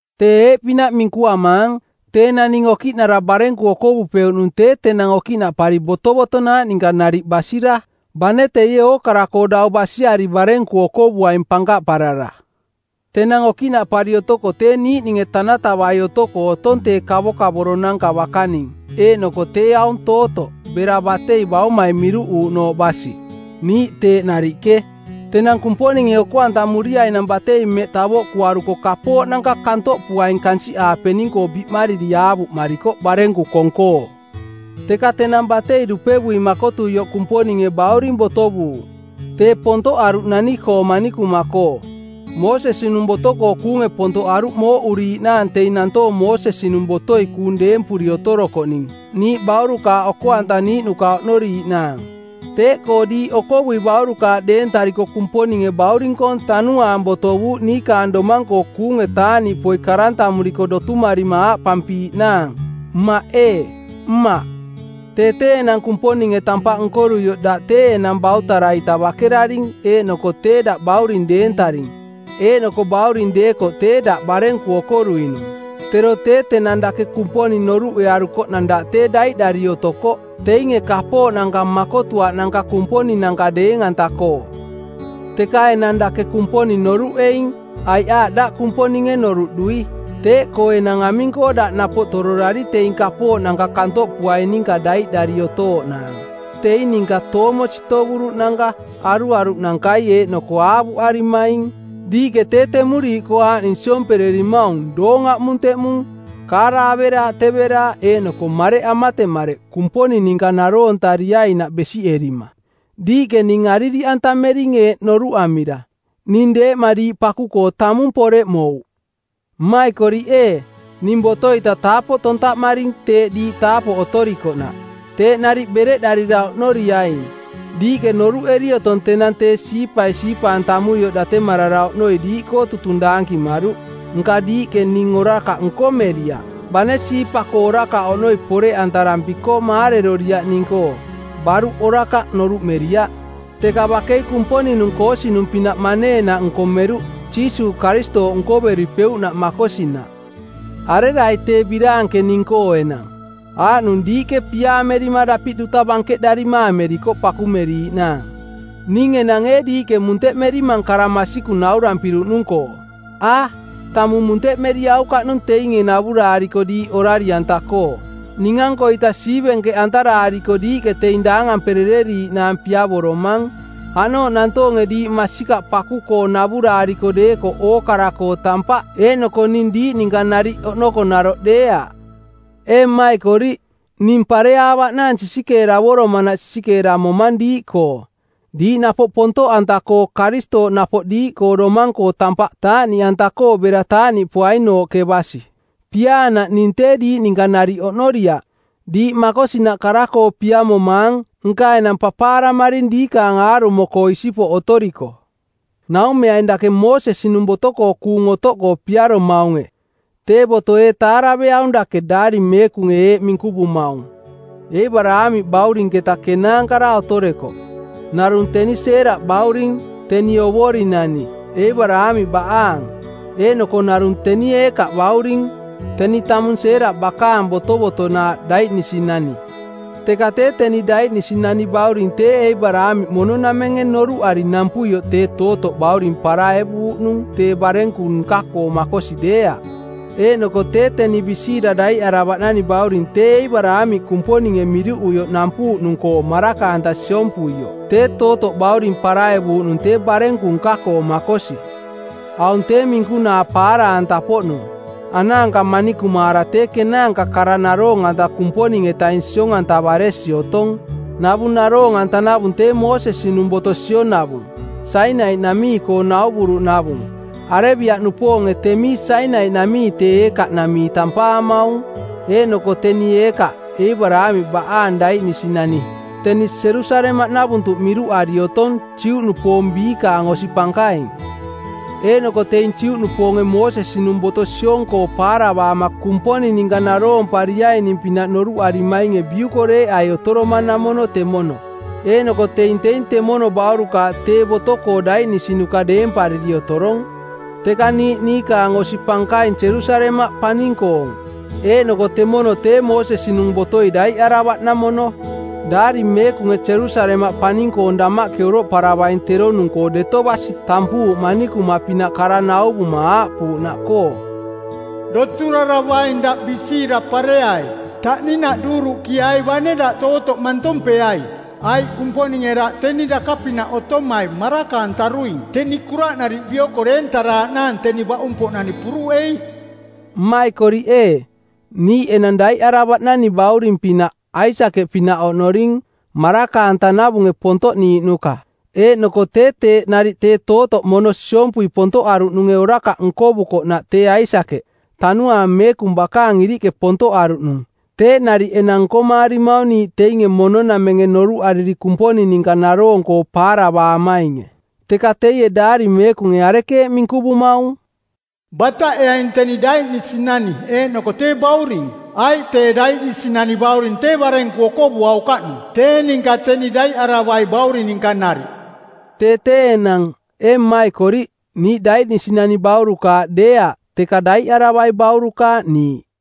Tee eeꞌpinaꞌ minkuamaang, tee naning okiꞌnara barenku okovupeuꞌnung tee tenang okiꞌnaꞌpari botovotonaaꞌ ninka nariꞌ basira, bane teie ookara-koo dau basiari barenku okovuaing pankaꞌparara. Tenang okiꞌnaꞌpari otoko tee niiꞌninge tanatavai otoko otong tee kavokavoro-nanka bakaning eeꞌnoko tee aung tootoꞌ bera batei baumai miruꞌuuꞌnooꞌ basi. Niiꞌ teeꞌ nariꞌke, tenang Kumponinge oko-antamuriainang batei mmeꞌ tavoꞌkuaruko kapooꞌnanka kantoꞌpuaing kansiꞌaapening-koo biꞌmariri aavuꞌmarikoꞌ˜ barenku kong-koo. Teka tenang batei dupevui makotuioꞌ Kumponinge bauring botovuuꞌ; Tee pontoꞌaruꞌ nani-koo manikuma-koo. Moosesi-nung boto-koo kuunge pontoꞌaruꞌ mooꞌuriiꞌnaang teing nantoong Moosesi-nung botoi kuung deempuri otorokoꞌning niiꞌ baurukaaꞌ oko-antaniiꞌnuka oꞌnoriiꞌnaang. Teeꞌkoo diiꞌ okovui baurukaaꞌ deentariko Kumponinge Bauring-koong Tanuaang botovuuꞌ niikaang domang-koo kuunge taaꞌniꞌpoi karantamuriko˜ dotumarima aaꞌpampiiꞌnaang, Mmaꞌ ee, Mmaꞌ. Tee tee enang Kumponinge tampaꞌ nkoruioꞌ daꞌ tee enang bautara-ita bakeraring eeꞌnoko tee daꞌ bauring deentaring, eeꞌnoko bauring deekoꞌ tee daꞌ barenku okoruinung. Tero tee tenang dake Kumponing noruꞌearukoꞌnang daꞌ tee daiꞌdari otokoꞌ teinge kapooꞌnanka makotuaꞌnanka kumponinanka deeng-anta-koo. Teka enang dake Kumponing noruꞌeing, aiꞌ aaꞌ daꞌ Kumponinge noruꞌdui. Teeꞌkoo enang aming-koo daꞌ napoꞌ tororari teing kapooꞌnanka kantoꞌpuaing ninka daiꞌdari otooꞌnaang, teing ninka toomo sitovuruꞌnanka, aruaruꞌnankai eeꞌnoko aavuꞌarimaing? Diiꞌke tee temuriiꞌkoo aaꞌning siompererimaung doong aꞌmunteꞌmung, kaara averaaꞌteveraaꞌ eeꞌnoko mareꞌ amatemareꞌ Kumponing ninka naroontariainaꞌ besiꞌerima. Diiꞌke ning aririꞌantamering eeꞌ noruꞌamira, “Ning deeꞌma diiꞌ paku-koo tamung poreꞌmouꞌ.” Mmaikoriꞌ ee, ning boto-ita taapoꞌ tontaꞌmaring teeꞌ diiꞌ taapoꞌ otorikoꞌnaꞌ. Teeꞌ nariꞌ bereꞌdarira oꞌnoriaing. Diiꞌke noruꞌeri otong tenang tee siipai siipa-antamuioꞌ datemarara oꞌnoi diiꞌkoo tutung daankimaruꞌ, nka diiꞌke ning orakaꞌ nkomeriaꞌ. Bane siipa-koo orakaꞌ oꞌnoi poreꞌantarampiko maareroriaꞌ ning-koo, baruꞌ orakaꞌ noruꞌmeriaꞌ, teka bakei Kumponing-nung koosinung˜pinaꞌ maneenaꞌ nkomeruꞌ, Jiisuuꞌ Karistooꞌ nkoveripeuꞌnaꞌ makosinaꞌ. Arerai tee biraanke ning-koo enang? Aaꞌnung diiꞌke piaamerima dapiꞌ duta bankeꞌdarima amerikoꞌ pakumeriiꞌnaang. Ning enang ee diiꞌke munteꞌmerimang kara masikung naurampiruꞌnung-koo? A, tamung munteꞌmeriaukaꞌnung teinge navuraariko diiꞌ orari-anta-koo. Ning-ankoita siivenkeꞌantaraariko diiꞌke teing daangamperereriiꞌnaang piavoromang. Aꞌnooꞌ nantoonge diiꞌ masikaꞌ paku-koo navuraariko deekoꞌ ookara-koo tampaꞌ eeꞌnoko ning diiꞌ ninka nariꞌ oꞌnoko naroꞌ deeaꞌ. Ee mmaikoriꞌ, ning pareaavaꞌnaang sisikeeravoromanaꞌ sisikeeramomang diiꞌkoo, diiꞌ napoꞌ pontoꞌanta-koo Karistooꞌ napoꞌ diiꞌkoo domang-koo tampaꞌ taaꞌniꞌanta-koo bera taaꞌniꞌpoainooꞌke basi. Piaanaꞌ ning tee diiꞌ ninka nariꞌ oꞌnoriaꞌ. Diiꞌ makosinaꞌ kara-koo piamomaang, nka enang papaaramaring diikaang aarumo-koo isipoꞌ otoriko. Naumeaing dake Moosesi-nung boto-koo kuung otoꞌkoo piaromaunge, tee boto ee taaraveaung dake? Daari Meekunge eeꞌ minkuvumaung: Eebaraamiꞌ baurinketa kenaankara otorekoꞌ, narung teni Seeraꞌ bauring, teni ovorinani, Eebaraamiꞌ baꞌaang. Eeꞌnoko narung teni Eekaaꞌ bauring, teni tamung Seeraꞌ bakaang botovotonaaꞌ, daiꞌnisinani. Teka tee teni daiꞌnisinani bauring tee Eebaraamiꞌ mono-namenge noruꞌari nampuioꞌ tee tootoꞌ bauring paraevuuꞌnung tee barenku nka-koo makosi deeaꞌ, eeꞌnoko tee teni bisiira daiꞌaravaꞌnani bauring tee Eebaraamiꞌ Kumponinge miruꞌuioꞌ nampuuꞌnung-koo maraka-anta siompuioꞌ tee tootoꞌ bauring paraevuuꞌnung tee barenku nka-koo makosi. Aung tee minkunaa paara-anta-poꞌnung. Anaanka manikumaara tee kenaanka kara naroong-anta Kumponing-etaing siong-antavaresi otong. Navung naroong-antanavung tee Moosesi-nung boto sionavung, Sainai-namii-koo nauvuruꞌnavung. Arebia-nupoonge temii Sainai-namii tee Eekaaꞌnamii tampaamaung. Eeꞌnoko teni Eekaaꞌ, Eebaraamiꞌ baꞌaang daiꞌnisinani, teni Jerusalemaꞌnavuntuꞌ miruꞌari otong, Juꞌnupoong biikaang osi pankaing. Eeꞌnoko teing Juꞌnupoonge Moosesi-nung boto siong-koo paaravaama Kumponing ninka naroompariaining-pinaꞌ noruꞌarimainge biukoreeꞌai otoromanamono temono. Eeꞌnoko teing teing temono baurukaaꞌ tee boto-koo daiꞌnisinuka deempariri otorong. Teka niiꞌ niikaang osi pankaing Jerusalemaꞌ paning-koong, eeꞌnoko temono tee Moosesi-nung botoi daiꞌaravaꞌnamono. Daari Meekunge Jerusalemaꞌ paning-koong damaꞌke oroꞌparavaing teronung-koo deto basi tampuuꞌ manikuma-pinaꞌ kara nauvuma aaꞌpuuꞌnaꞌkoo: “Doturaravaing daꞌ bisiira pareai. Taꞌninaꞌ duuruꞌkiai bane daꞌ tootoꞌ mantompeai. Aiꞌ Kumponinge daꞌ teni daka-pinaꞌ otomai maraka-antaruing teni kuraꞌnariꞌ bioko deentaraaꞌnaang teni baꞌung-poꞌnani puruꞌei.” Mmaikoriꞌ ee, niiꞌ enang daiꞌaravaꞌnani bauring pinaꞌ, Aisakeꞌ pinaꞌ oꞌnorining, maraka-antanavunge pontoꞌniiꞌnuka. Eeꞌnoko tee teeꞌ nariꞌ tee tootoꞌ mono siompui pontoꞌaruꞌnunge orakaꞌ nkovukoꞌnaꞌ tee Aisakeꞌ, Tanuaang Meekung bakaang iriꞌke pontoꞌaruꞌnung, teeꞌ nariꞌ enang nkomaarimaung niiꞌ teinge mono-namenge noruꞌariri Kumponing ninka naroong-koo paaravaamainge. Teka teie Daari Meekunge arekeeꞌ minkuvumaung? “Bataꞌeaing teni daiꞌnisinani eeꞌnoko tee bauring, aiꞌ tee daiꞌnisinani bauring tee barenku okovuaukaꞌnung tee ninka teni daiꞌaravai bauring ninka nariꞌ.” Tee tee enang, ee mmaikoriꞌ, niiꞌ daiꞌnisinani baurukaaꞌ deeaꞌ teka daiꞌaravai baurukaaꞌ niiꞌ.